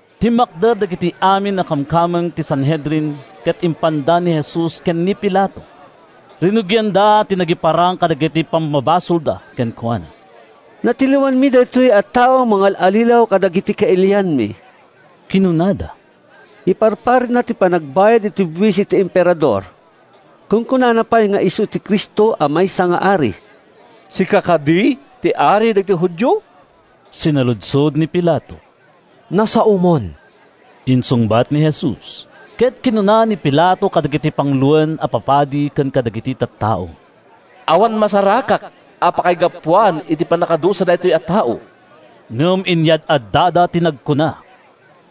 Timmakder dagiti amin a kamkameng ti Sanhedrin ket impanda ni Jesus ken ni Pilato. Rinugianda ti nagiparang kadagiti pammabasolda kenkuana. “Natiliwanmi daytoy a tao a mangal-allilaw kadagiti kailianmi,” kinunada. “Iparparitna ti panagbayad iti buis iti Emperador. Kunkunana pay nga isu ti Cristo a maysa nga ari.” “Sika kadi ti Ari dagiti Judio?” sinaludsod ni Pilato. “Nasaomon,” insungbat ni Jesus. Ket kinuna ni Pilato kadagiti panguloen a papadi ken kadagiti tattao, “Awan masarakak a pakaigapuan iti pannakadusa daytoy a tao.” Ngem inyad-addada ti nagkuna: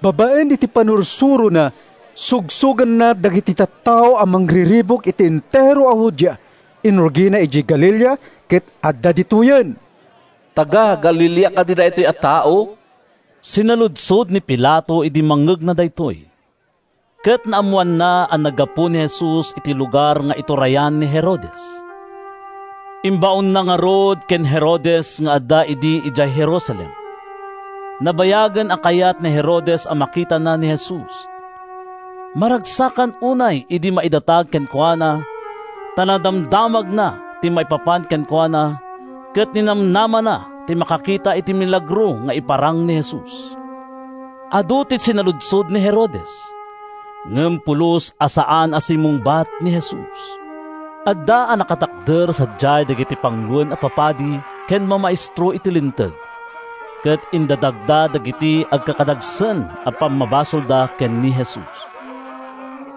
“Babaen iti pannursurona, sugsoganna dagiti tattao a mangriribuk iti entero a Judea. Inrugina idiay Galilea, ket adda ditoyen.” “Taga-Galilea kadi daytoy a tao?” sinaludsod ni Pilato idi mangngegna daytoy. Ket naammoanna a naggapu ni Jesus iti lugar nga iturayan ni Herodes. Imbaonna ngarud ken ni Herodes nga adda idi idiay Jerusalem. Nabayagen a kayat ni Herodes a makitana ni Jesus. Maragsakan unay idi maidatag kenkuana ta nadamdamagnan ti maipapan kenkuana ket ninamnamana ti makakita iti milagro nga iparang ni Jesus. Adu ti sinaludsod ni Herodes, ngem pulos a saan a simmungbat ni Jesus. Adda a nakatakder sadiay dagiti panguloen a papadi ken mamaestro iti Linteg ket indatagda dagiti agkakadagsen a pammabasolda ken ni Jesus.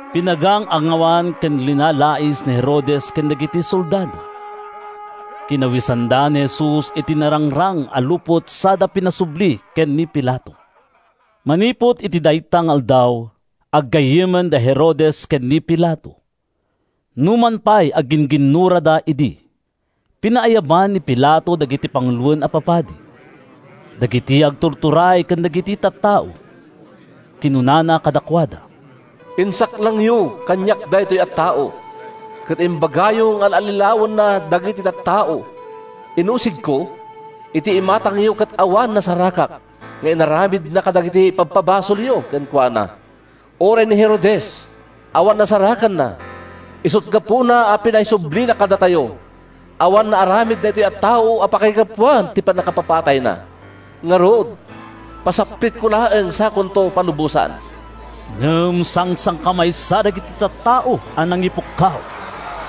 Pinagang-angawan ken linalais ni Herodes ken dagiti soldado. Kinawesanda ni Jesus iti narangrang a lupot sada pinaisubli ken ni Pilato. Manipud iti dayta nga aldaw, aggayyemen da Herodes ken ni Pilato, numan pay aggin-ginnurada idi. Pinaayaban ni Pilato dagiti panguloen a papadi, dagiti agtuturay ken dagiti tattao. Kinunana kadakuada, “Insaklangyo kaniak daytoy a tao ket imbagayo nga al-allilawenna dagiti tattao. Inusigko iti imatangyo ket awan nasarakak nga inaramidna kadagiti ipabpabasolyo kenkuana. Uray ni Herodes, awan nasarakanna, isut’ gapuna a pinaisublina kadatayo. Awan naaramid daytoy a tao a pakaigapuan ti pannakapapatayna. Ngarud, pasaplitko laeng sakonto palubosan.” Ngem sangsangkamaysa dagiti tattao a nangipukkaw,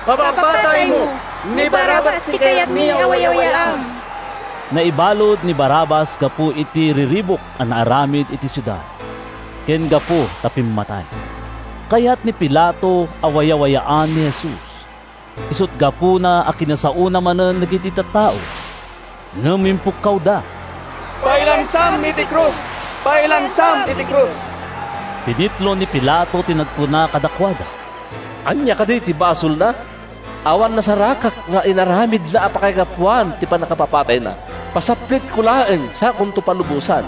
“Papapataymo! Ni Barrabas ti kayatmi a wayawayaam!” ( Naibalud ni Barrabas gapu iti riribuk a naaramid iti siudad, ken gapu ta pimmatay.) Kayat ni Pilato a wayawayaan ni Jesus, isut’ gapuna a kinasaona manen dagiti tattao. Ngem impukkawda, “Pailansam iti krus! Pailansam iti krus!” Pinitlo ni Pilato ti nagkuna kadakuada, “Ania kadi ti basolna? Awan nasarakak nga inaramidna a pakaigapuan ti pannakapapatayna. Pasaplitko laeng sakonto palubosan.”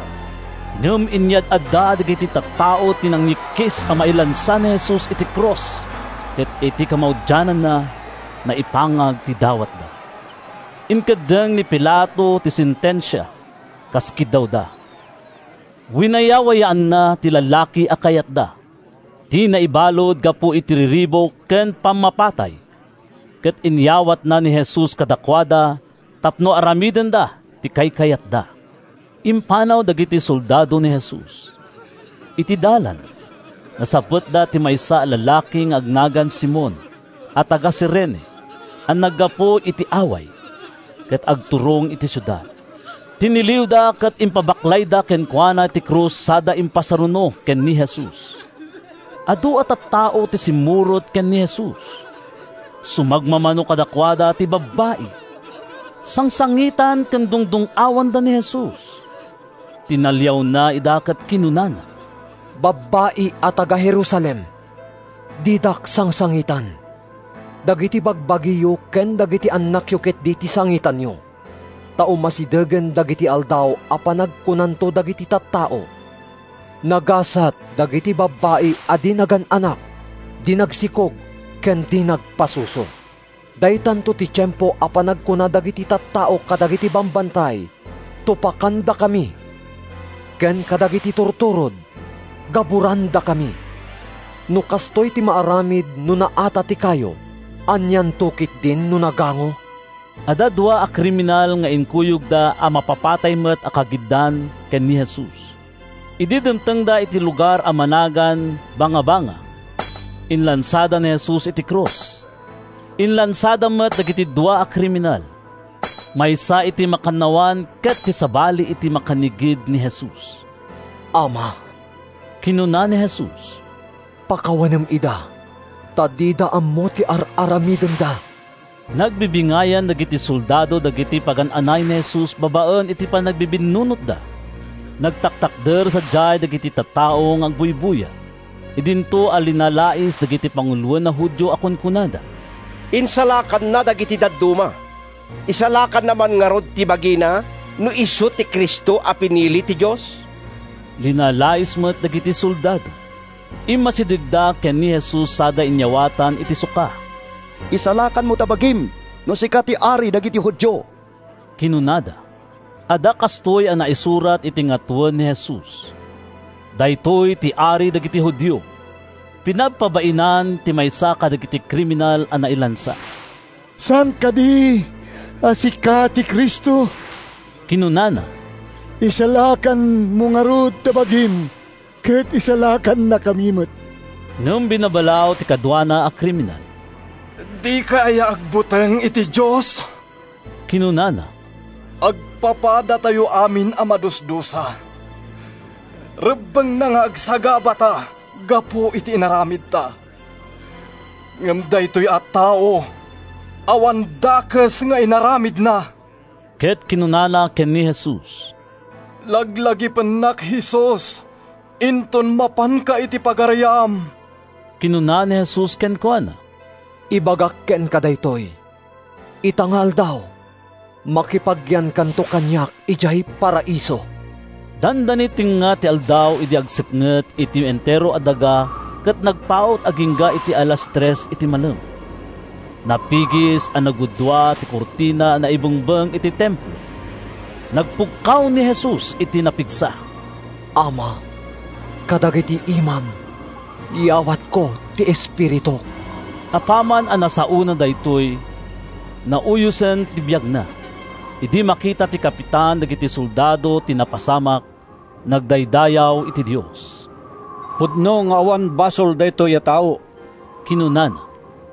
Ngem inyad-adda dagiti tattao ti nangyikkis a mailansa ni Jesus iti krus ket iti kamaudianna, naipangag ti dawatda. Inkeddeng ni Pilato ti sentensia, kas kiddawda. Winayawayaanna ti lalaki a kayatda, ti naibalud gapu iti riribuk ken pammapatay, ket inyawatna ni Jesus kadakuada tapno aramidenda ti kaykayatda. Impanaw dagiti soldado ni Jesus. Iti dalan, nasabetda ti maysa a lalaki nga agnagan Simon a taga-Cirene a naggapu iti away, ket agturong iti siudad. Tiniliwda ket impabaklayda kenkuana ti krus sada impasaruno ken ni Jesus. Adu a tattao ti simmurot ken ni Jesus. Sumagmamano kadakuada ti babbai. Sangsangitan ken dungdung-awanda ni Jesus. Tinaliawna ida ket kinunana, “Babbai a taga-Jerusalem, didak sangsangitan! Dagiti bagbagiyo ken dagiti annakyo ketdi ti sangitanyo! Ta umasidegen dagiti aldaw a panagkunanto dagiti tat-tao, ‘Nagasat dagiti babbai a di nagan-anak, di nagsikog ken di nagpasuso!’ Daytanto ti tiempo a panagkuna dagiti tattao kadagiti bambantay, ‘Tupakandakami!’ ken kadagiti turturod, ‘Gaburandakami!’ No kastoy ti maaramid no naata ti kayo, anianto ketdin no nagango?” Adda dua a kriminal nga inkuyogda a mapapatay met a kagiddan ken ni Jesus. Idi dimtengda iti lugar a managan “Bangabanga,” inlansada ni Jesus iti krus. Inlansada met dagiti dua a kriminal, maysa iti makannawan ket ti sabali iti makannigid ni Jesus. “Ama,” kinuna ni Jesus, “pakawanem ida ta dida ammo ti ar-aramidenda.” Nagbibingayan dagiti soldado dagiti pagan-anay ni Jesus babaen iti panagbibinnunotda. Nagtatakder sadiay dagiti tattao nga agbuybuya idinto a linalais dagiti panguloen a Judio a kunkunada, “Insalakanna dagiti dadduma. Isalakanna man ngarud ti bagina no isu ti Cristo a pinili ti Dios!” Linalais met dagiti soldado. Immasidegda ken ni Jesus sada inyawatan iti suka. “Isalakanmo ta bagim, no sika ti Ari dagiti Judio!” kinunada. Adda kastoy a naisurat iti ngatoen ni Jesus: “Daytoy ti Ari dagiti Judio.” Pinabpabainan ti maysa kadagiti kriminal a nailansa. “Saan kadi a sika ti Cristo?” kinunana. “Isalakanmo ngarud ta bagim ket isalakannakami met!” Ngem binabalaw ti kaduana a kriminal. “Dika aya agbuteng iti Dios?” kinunana. “Agpapadatayo amin a madusdusa. Rebbengna nga agsagabata gapu iti inaramidta. Ngem daytoy a tao, awan dakes nga inaramidna.” Ket kinunana ken ni Jesus, “Laglagipennak, Jesus, inton mapanka iti pagariam.” Kinuna ni Jesus kenkuana, “Ibagak kenka daytoy: Ita nga aldaw, makipagyankanto kaniak idiay Paraiso.” Dandani tengnga ti aldaw idi agsipnget iti entero a daga ket nagpaut agingga iti alas tres iti malem. Napigis a naggudua ti kurtina a naibengbeng iti Templo. Nagpukkaw ni Jesus iti napigsa: “Ama, kadagita imam yawatko ti espirituk!” Apaman a nasaona daytoy, nauyosen ti biagna. Idi makita ti kapitan dagiti soldado ti napasamak, nagdaydayaw iti Dios. “Pudno nga awan basol daytoy a tao!” kinunana.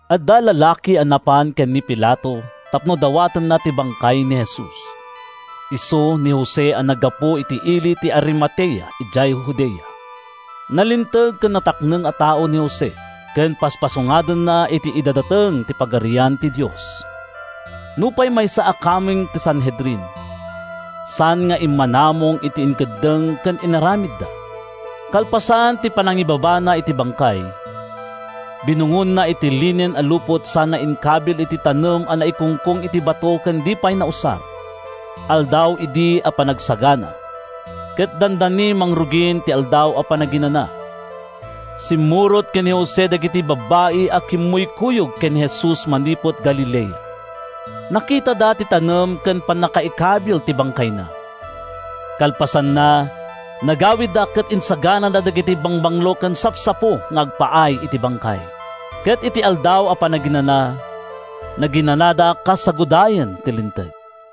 Adda lalaki a napan ken ni Pilato tapno dawatenna ti bangkay ni Jesus. Isu ni Jose a naggapu iti ili ti Arimatea idiay Judea. Nalinteg ken natakneng a tao ni Jose ken paspasungadenna ti idadateng ti Pagarian ti Dios. Nupay maysa a kameng ti Sanhedrin, saan nga immanamong iti inkeddeng ken inaramidda. Kalpasan ti panangibabana iti bangkay, binungonna iti linen a lupot sana inkabil iti tanem a naikungkong iti bato ken di pay nausar. Aldaw idi a Panagsagana, ket dandani mangrugin ti Aldaw a Panaginana. Simmurot ken ni Jose dagiti babbai a kimmuykuyog ken ni Jesus manipud Galilea. Nakitada ti tanem ken ti pannakaikabil ti bangkayna. Kalpasanna, nagawidda ket insaganada dagiti bangbanglo ken sapsapo nga agpaay iti bangkay. Ket iti Aldaw a Panaginana, naginanada kas sagudayen ti Linteg.